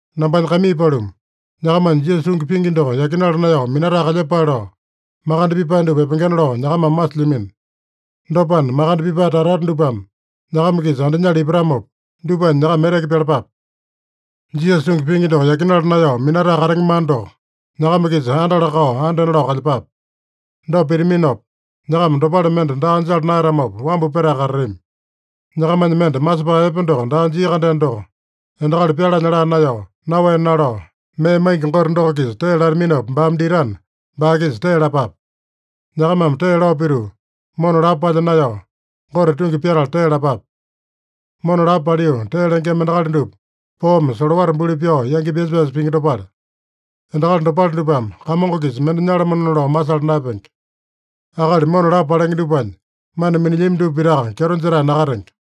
Nambanya kaimii paluma, nyakamanya Jisasa tungi pingi doko yakinala naeyao minatae kalyepale lao, makande pipae dupa epengena lao nyakamame masilyamino. Dopana, makande pipae tata-tata dupame nyakama-kisa andinyala ipatamopa, dupanya nyakama eteke pyalapape. Jisasa tungi pingi doko yakinala naeyao minatae katenge mana doko nyakama-kisa andala-kao andena lao kalyepape. Dopa pitaminopa, nyakama dopale mende daa jala naeyatamopa wambu petae katatami. Nyakamanya mende masepae epe doko daa jia-kandeno doko, endakali pyalanya laa naeyao, naowe nalao, mee maingi Gote doko-kisa tee lataminopa baame ditana, baa-kisa tee lapape. Nyakamame tee lao pituu, mona lapo palya naeyao, Gote tungi pyatala tee lapape. Mona lapo paliu tee lengema endakali dupa, poome solowata buli pyao yangi pyasa-pyasa pingi dopale. Endakali dopale dupame Kamongo-kisa mende nyalamanona lao masala naeyapenge. Akali mona lapo palenge dupanya mana minilyami dupa pitaka kyeto jetae nakatenge.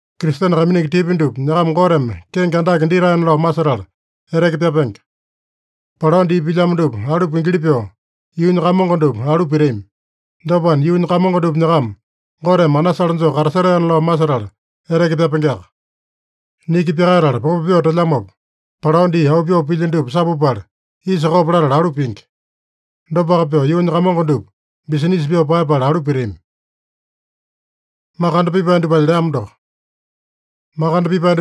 Kristene kaiminingi tipya dupa nyakama Goteme kenge andake ditaena lao masetala eteke pyapenge. Palao dii pilyamo dupa alu pingili pyoo, yuunya kamongo dupa alu pitami. Dopana, yuunya kamongo dupa nyakama Goteme anasale joo katasetaena lao masetala eteke pyapengeaka. Niki pyakaetala popo pyoo telyamopa, palao dii auu pyoo pilya dupa sapupala, isa kopo latala alu pingi. Dopaka pyoo yuunya kamongo dupa bisinisa pyoo paeyapala alu pitami. Makande pipae dupa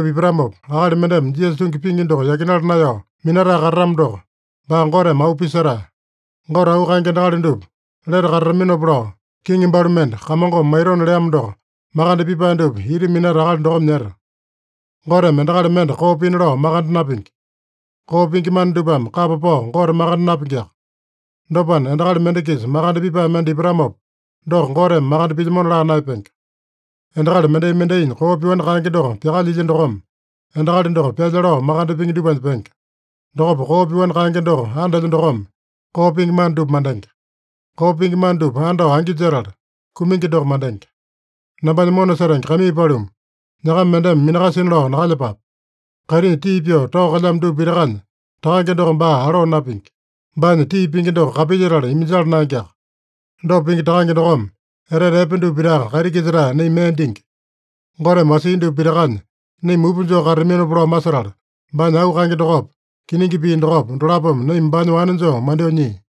ipatamopa, akali mendeme Jisasa tungi pingi doko yakinala naeyao minatae katatamo doko, baa Goteme auu pisetae. Gote auu kaenge endakali dupa lete katataminopa lao, kiŋi balu mende, Kamongome maitona leamo doko, makande pipae dupa ita minata akali dokome nyeta. Goteme endakali mende koo pina lao makande napingi. Koo pingi mana dupame kapa pao Gote makande napingiaka. Dopana, endakali mende-kisa makande pipae mende ipatamopa, doko Goteme makande pilyamona laa naeyapenge. Endakali mendai-mendainya koo pyoani kaenge doko pyakalyilya dokome, endakali doko pyalya lao makande pingi dupanya penge. Dokopa koo pyoani kaenge doko andelya dokome, koo pingi mana dupa mandenge. Koo pingi mana dupa andao angi jetala, kumingi doko mandenge. Nambanya mona setenge kaimii paluma, nyakama mendeme minakasina lao nakalyepape. Kaitinya tii pyoo tao kalyamo dupa pitakanya Takange doko baa aloo napingi. Baanya tii pingi doko kapilyetala iminjala naengeaka. Dopa pingi Takange dokome etete epe dupa pitaka kaiti-kisa-tae naima mee dingi. Goteme wasia dupa pitakanya naima mupa joo katataminopa lao masetala, baanya auu kaenge dokopa, kiningi pii dokopa, dolapome naima baanya wane joo mandyoo nyia.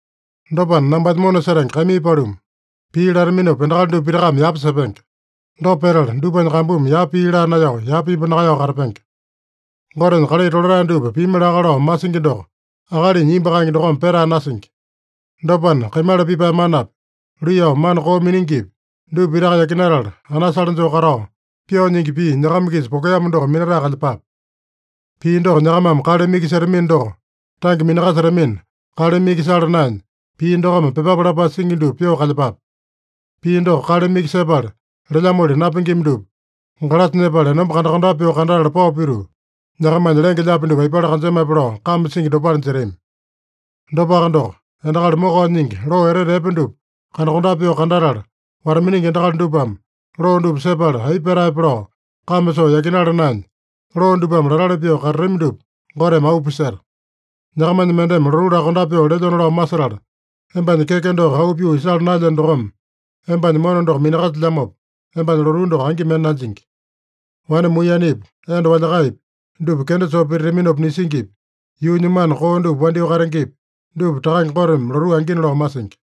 Dopana, nambanya mona setenge kaimii paluma, pii lataminopa endakali dupa pitakame yapa sepenge. Dopa petala, dupanya kambumi yapa pii laa naeyao, yapa imbu nakaeyao katapenge. Gotenya kalai tolatae dupa pimi laka lao masingi doko akalinya imbu kaenge dokome petae nasingi. Dopana, kaimala pipae manapi, luiyao mana koo miningipi, dupa pitaka yakinatala, anasale joo katao, pyoo nyingi pii nyakama-kisa pokeamo doko minatae kalyepape. Pii doko nyakamame kaleme iki setamino doko, tange minakasetamina, kaleme iki sala naenya, pii dokome pyepape lapae singi dupa pyoo kalyepape. Pii doko kaleme iki sepala lelyamoli napingima dupa, galasa nyepala enomba kandakondape pyoo kandatala pao pituu, nyakamanya lenge-lyaapi dupa aipale kanjemape lao kame singi dopale jetami. Dopaka doko, endakali mokao nyingi loo etete epe dupa kandakondape pyoo kandatala wata-miningi endakali dupame, loo dupa sepala aipa petaepe lao kame soo yakinala naenya, loo dupame latali pyoo katatami dupa Goteme auu piseta. Nyakamanya mendeme lotuu lakondape pyoo lelyona lao masetala, embanya keke doko auu pyoo isala naelyeno dokome, embanya mona doko minakasilyamopa, embanya lotuu doko angi mende nanjingi. Wane muiyenepi, enda walyakaepi, dupa kenda soo pititaminopa nisingipi, yuunya mana koo dupa wandyoo katengepi, dupa Takange Goteme lotuu angina lao masingi.